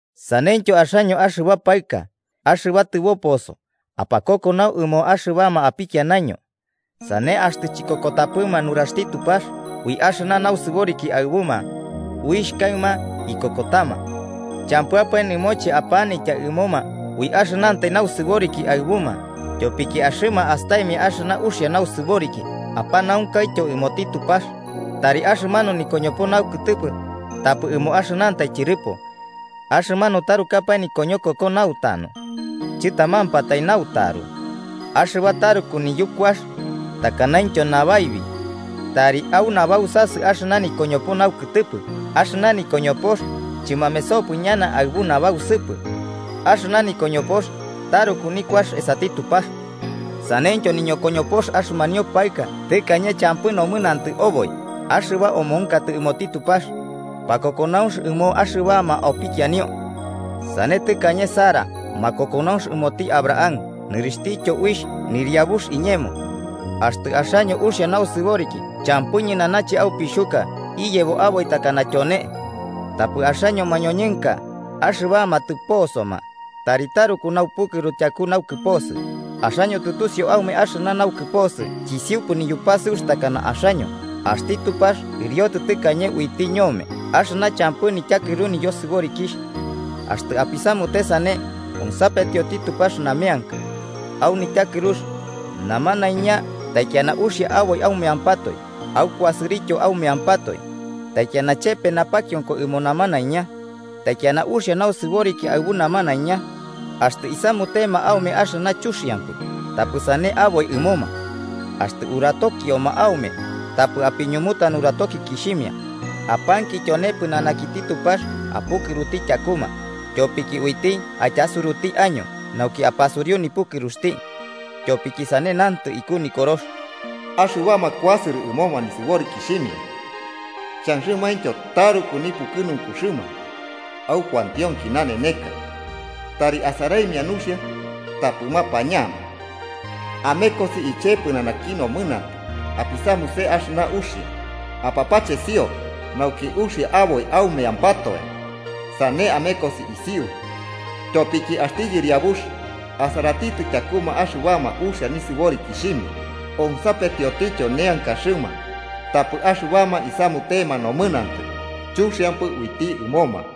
Saneityo axaño axɨba paɨka, axɨba tɨboposo, apakokonau ɨmoma axɨbama apikianaño. Sane axtɨ chikokotapɨma nuraxti Tupax, ui axɨna nausɨboriki aɨbuma uixh kaɨma ikokotama. Champɨapae nɨmoche apanitya ɨmoma ui axɨnantai nausɨboriki aɨbuma, tyopiki axɨma astaimia axɨna uxia nausɨboriki apanaunkaityo ɨmoti Tupax. Tari axɨmanu nikoñopo naukɨtɨpɨ tapɨ ɨmo axɨnantai tyɨrɨpo, axɨmanu tarukapae nikoñokoko nautanu, chɨtamampatai nautaru axɨba taruku niyukuax takanaintyo nabaibi, tari au nabausasɨ axɨna nikoñopo naukɨtɨpɨ, axɨna nikoñopox chɨmamesopɨ ñana aɨbu nabausɨpɨ. Axɨna nikoñopox taruku nikuax esati Tupax. Saneityo niñokoñopox axɨmanio paɨka tɨkañe champɨ nomɨnantɨ oboi, axɨba omonkotɨ ɨmoti Tupax, pakokonaunx ɨmoma axɨbama opikianio. Sane tɨkañe Sara, makokonaunx ɨmoti Abraham nɨrixhtityo uixh “nɨriabux iñemo.” Axtɨ axaño uxia nausɨboriki champɨ ñɨnanache aupixhuka iyebo aboi takana tyone. Tapɨ axaño mañoñɨnka, axɨbama tɨposoma, tari taruku naupukɨru tyaku naukɨposɨ, axaño tɨtusiu aume axɨna naukɨposɨ chisiupɨ niyupasɨux takana axaño, axti Tupax ɨriotɨ tɨkañe uiti ñome axɨna champɨ nityakɨru niyosɨborikixh. Axtɨ apisamute sane, onsapetioti Tupax nameanka. Au nityakɨrux, namanaiña taikiana uxia aboi aumeampatoe, aukuasɨrɨtyo aumeampatoe. Taikiana chepe napakionko ɨmo namanaiña. Taikiana uxia nausɨboriki aɨbu namanaiña. Axtɨ isamutema aume axɨna chuxiampɨ, tapɨ sane aboi ɨmoma, axtɨ uratokioma aume, tapɨ apiñumuta nuratokikixhimia. Apanki tyone pɨnanakiti Tupax apukɨruti tyakuma, tyopiki uiti aityasuruti año nauki apasuriu nipukɨruxti. Tyopiki sane nantɨ iku Nikorox: “Axɨbama kuasɨrɨ ɨmoma nisɨborikixhimia xhanxɨmaintyo taruku nipukɨnunkuxɨma au kuantionki naneneka, tari asaraimia nuxia tapɨ mapañama. Amekosi iche pɨnanaki nomɨnantɨ apisamuse axɨna uxia, apapachesio nauki uxia aboi aumeampatoe sane amekosi isiu. Tyopiki axti Yɨriabux asaratitɨ tyakuma axɨbama uxia nisɨborikixhimia onsapetiotityo neankaxɨma, tapɨ axɨbama isamutema nomɨnantɨ, chuxiampɨ uiti ɨmoma.”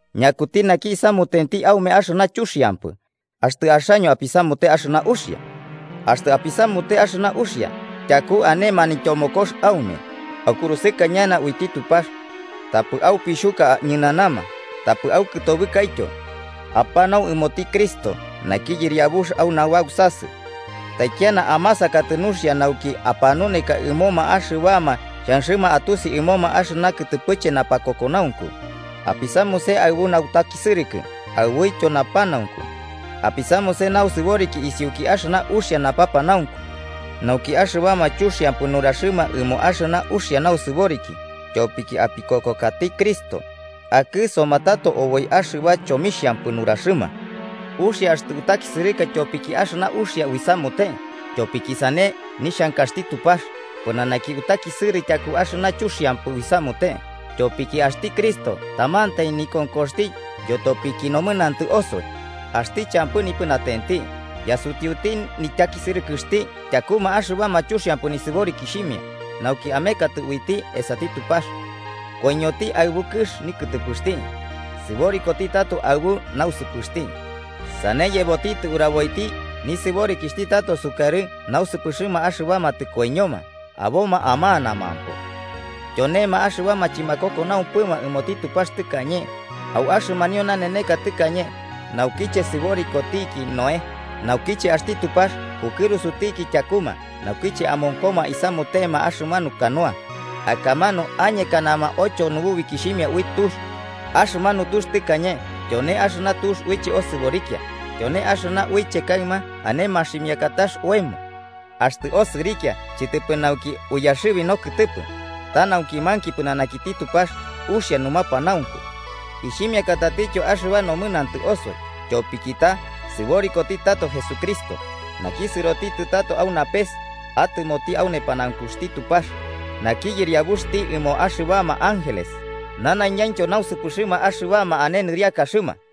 ¿Ñakutipɨ naki isamutenti aume axɨna chuxiampɨ, axtɨ axaño apisamute axɨna uxia? Axtɨ apisamute axɨna uxia, tyaku ane manityomokotox aume, aukurusɨka ñana uiti Tupax. Tapɨ aupixhuka ñɨnanama, tapɨ aukɨtobɨkaityo. Apanau ɨmoti Cristo naki Yɨriabux au nabausasɨ. Taikiana amasankatɨ nuxia nauki apanuneka ɨmoma axɨbama xhanxɨma atusi ɨmoma axɨna kɨtɨpɨche napakokonaunku, apisamuse aɨbu nautakisɨrɨkɨ aɨbuityo napanaunku. Apisamuse nausɨboriki isiuki axɨna uxia napapanaunku, nauki axɨbama chuxiampɨ nuraxɨma ɨmo axɨna uxia nausɨboriki tyopiki apikokokati Cristo, akɨsoma tato oboi axɨba chomixhampɨ nuraxɨma. Uxia axtɨ utakisɨrɨka tyopiki axɨna uxia uisamute, tyopiki sane nixhankaxti Tupax, pɨnanaki utakisɨrɨ tyaku axɨna chuxiampɨ uisamute. Tyopiki axti Cristo tamantai nikonkoxti yotopiki nomɨnantɨ osoi. Axti champɨ nipɨnatenti, yasutiuti nityakisɨrɨkɨxti tyakuma axɨbama chuxiampɨ nisɨborikixhimia, nauki amekatɨ uiti esati Tupax. Koiñoti aɨbu kɨx nikɨtɨpɨxti. Sɨborikoti tato aɨbu nausɨpɨxti, sane yebotitɨ uraboiti nisɨborikixhti tato sukarɨ nausɨpɨxɨma axɨbama tɨkoiñoma aboma amanamampo. Tyonema axɨbama chɨmakokonaunxɨpɨma ɨmoti Tupax tɨkañe, au axɨmanio naneneka tɨkañe naukiche sɨborikotiki Noé, naukiche axti Tupax pukɨrusutiki tyakuma naukiche amonkoma isamutema axɨmanu canoa, akamanu añekanama ocho nubukixhimia ui tux. Axɨmanu tux tɨkañe tyone axɨna tux uiche osɨrikia, tyone axɨna uiche kaɨma ane maximiakatax oemo. Axtɨ osɨrikia chɨtɨpɨ nauki uiyaxɨbi nokɨtɨpɨ, ta nauki manki pɨnanakiti Tupax uxia numapanaunku, ixhimiakatityo axɨba nomɨnantɨ osoi tyopiki ta sɨborikoti tato Jesucristo, naki sɨrotitɨ tato au napes atɨmoti au nepanaunkuxti Tupax, naki Yɨriabuxti ɨmoma axɨbama ángeles nanaiñaintyo nausɨpɨxɨma axɨbama ane nɨriakaxɨma.